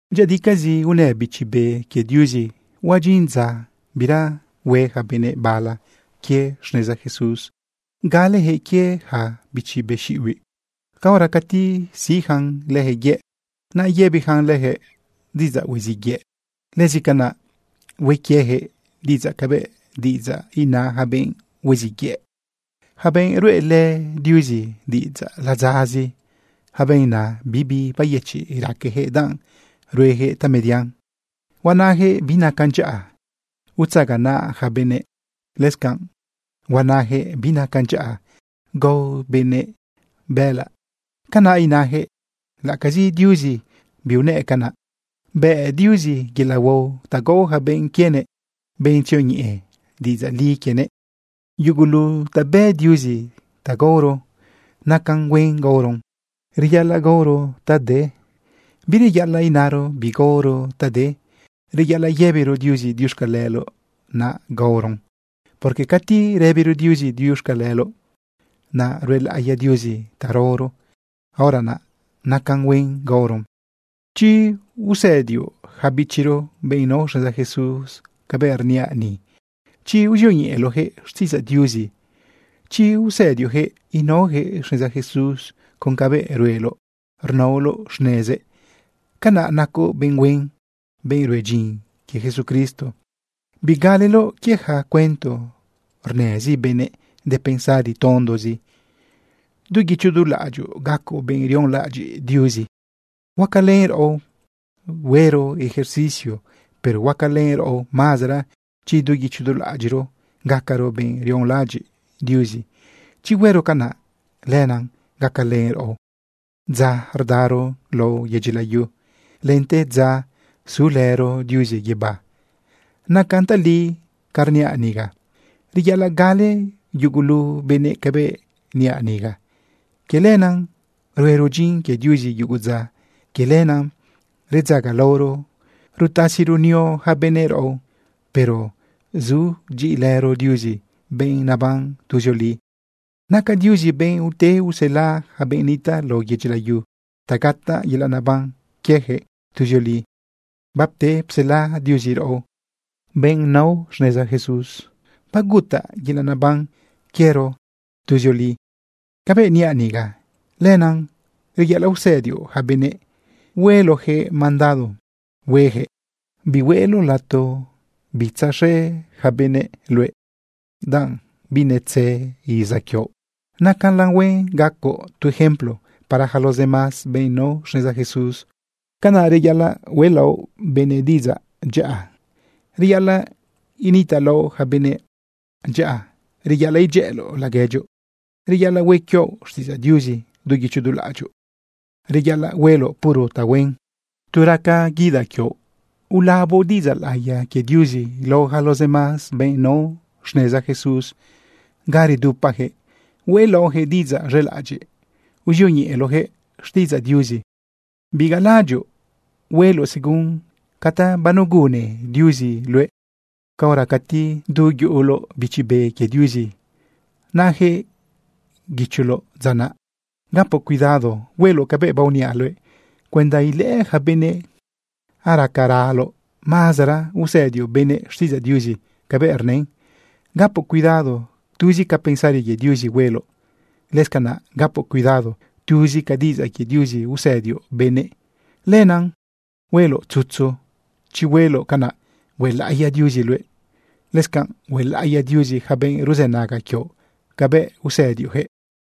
Dyëꞌëdicazi unë Bichi Be quie Diuzi huadyin dza bira hue yaca benëꞌ bala quie xneza Jesús. Galeyaquëꞌ quie yaca bichi be xiꞌibiꞌ caora cati siꞌyacan lëjëꞌ yëꞌ, naꞌ yëbiyacan lëjëꞌ diꞌidzaꞌ huiziꞌ yëꞌ. Lëscanaꞌ hue quieyaquëꞌ diꞌidzaꞌ cabëꞌ diꞌidzaꞌ ina yaca benꞌ huiziꞌ yëꞌ, yaca benꞌ ruꞌelë Diuzi diꞌidzaꞌ ladzazi. Yaca benꞌ naꞌ, bibi bayëchiꞌ raqueyaquëꞌ danꞌ rueyaquëꞌ tamedian. Huanayaquëꞌ binacan dyaꞌa utzaganaꞌ yaca benëꞌ. Lëscanꞌ huanayaquëꞌ binacan dyaꞌa gao benëꞌ bëꞌëlaꞌ. Canaꞌ inayaquëꞌ laꞌacazi Diuzi biunëꞌ canaꞌ. Bë Diuzi yelaꞌ huao ta gao yaca benꞌ quienëꞌ, benꞌ tzioñeꞌe diꞌidzaꞌ li quienëꞌ. Yugulu ta bë Diuzi ta gaoro, nacan huen gaoron. Reyaꞌalaꞌ gaoro ta de, bireyaꞌalaꞌ inaro bigaoro ta de. Reyaꞌalaꞌ yëbiro Diuzi diuxcaleloꞌ naꞌ gaoron. Porque cati rëbiro Diuzi diuxcaleloꞌ, naꞌ ruelaꞌiya Diuzi ta raoro, hora naꞌ nacan huen gaoron. Chi usëdioꞌ yaca bichiro, benꞌ nao xneza Jesús, cabëꞌ rniaꞌ ni, chi uzioñeꞌeloꞌyaquëꞌ xtiꞌidzaꞌ Diuzi, chi usëdioꞌyaquëꞌ inaoyaquëꞌ xneza Jesús con cabëꞌ rueloꞌ rnaoloꞌ xnezëꞌ, canaꞌ nacoꞌ benꞌ huen, benꞌ rue dyin quie Jesucristo. Bigaleloꞌ quie yaca cuento rnëzi benëꞌ de pensari tondozi. Du guicho du laꞌadyoꞌ gacoꞌ benꞌ rionlaꞌadyiꞌ Diuzi. Huacalën raꞌo huero ejercicio, pero huacalën raꞌo mazara chi du guicho du laꞌadyiꞌro gacaro benꞌ rionlaꞌadyiꞌ Diuzi. Chi huero canaꞌ, lenaꞌ gacalen raꞌo dza rdaro lao yedyi layu lente dza sulëro Diuzi guibá. Nacan tali ca rniaꞌ niga. Reyaꞌalaꞌ gale yugulu benëꞌ cabëꞌ niaꞌ niga. Quie lenaꞌ ruero dyin quie Diuzi yugu dza. Quie lenaꞌ redzagalaoro rutasi runio yaca benëꞌ raꞌo. Pero sudyiꞌilëro Diuzi, benꞌ naban tuzioli. Naca Diuzi benꞌ ute usela yaca benꞌ nitaꞌ lao yedyi layu ta gataꞌ yelaꞌ neban quieyaquëꞌ tuzioli. Bapte psela Diuzi raꞌo, benꞌ nao xneza Jesús, bagutaꞌ yelaꞌ neban quiero tuzioli. Cabëꞌ niaꞌ niga, lenaꞌ reyaꞌalaꞌ usëdioꞌ yaca benëꞌ hueloꞌjëꞌ mandado huejëꞌ. Bihueloꞌ lato uz̃ëꞌ yaca benëꞌ luëꞌ danꞌ binetze iza quioꞌ. Nacalan huen gacoꞌ tu ejemplo para yaca los demás benꞌ nao xneza Jesús. Canaꞌ reyaꞌalaꞌ hueꞌlaoꞌ benëꞌ diꞌidzaꞌ dyaꞌa. Reyaꞌalaꞌ initaꞌlaoꞌ yaca benëꞌ dyaꞌa. Reyaꞌalaꞌ idyëꞌëloꞌ laguedyoꞌ. Reyaꞌalaꞌ hue quioꞌ xtiꞌidzaꞌ Diuzi du guicho du laꞌadyoꞌ. Reyaꞌaloꞌ hueloꞌ puro tahuen. Tu raca guidaꞌ quioꞌ, ulaboꞌ diꞌidzaꞌ laꞌiya quie Diuzi lao yaca los demás benꞌ nao xneza Jesús ga redupayaquëꞌ. Hueꞌlaoꞌyaquëꞌ diꞌidzaꞌ z̃elaꞌadyiꞌ, uzioñeꞌeloꞌyaquëꞌ xtiꞌidzaꞌ Diuzi. Bigalalaꞌadyoꞌ hueloꞌ según ca ta banegunne Diuzi luëꞌ caora cati du yuꞌuloꞌ Bichi Be quie Diuzi, naꞌayaquëꞌ guicholoꞌ dza naꞌ. Gapoꞌ cuidado hueloꞌ cabëꞌ baoniaꞌ luëꞌ cuenda ilëꞌë yaca benëꞌ aracaraloꞌ mazara usëdioꞌ benëꞌ xtiꞌidzaꞌ Diuzi cabëꞌ rnën. Gapoꞌ cuidado tuzi ca pensari quie Diuzi hueloꞌ. Lëscanaꞌ gapoꞌ cuidado tuzi ca diꞌidzaꞌ quie Diuzi usëdioꞌ benëꞌ. Lenaꞌ hueloꞌ tzutzu. Chi hueloꞌ canaꞌ, huelaꞌiya Diuzi luëꞌ. Lëscanꞌ huelaꞌiya Diuzi yaca benꞌ ruzënaga quioꞌ cabëꞌ usëdioꞌjëꞌ.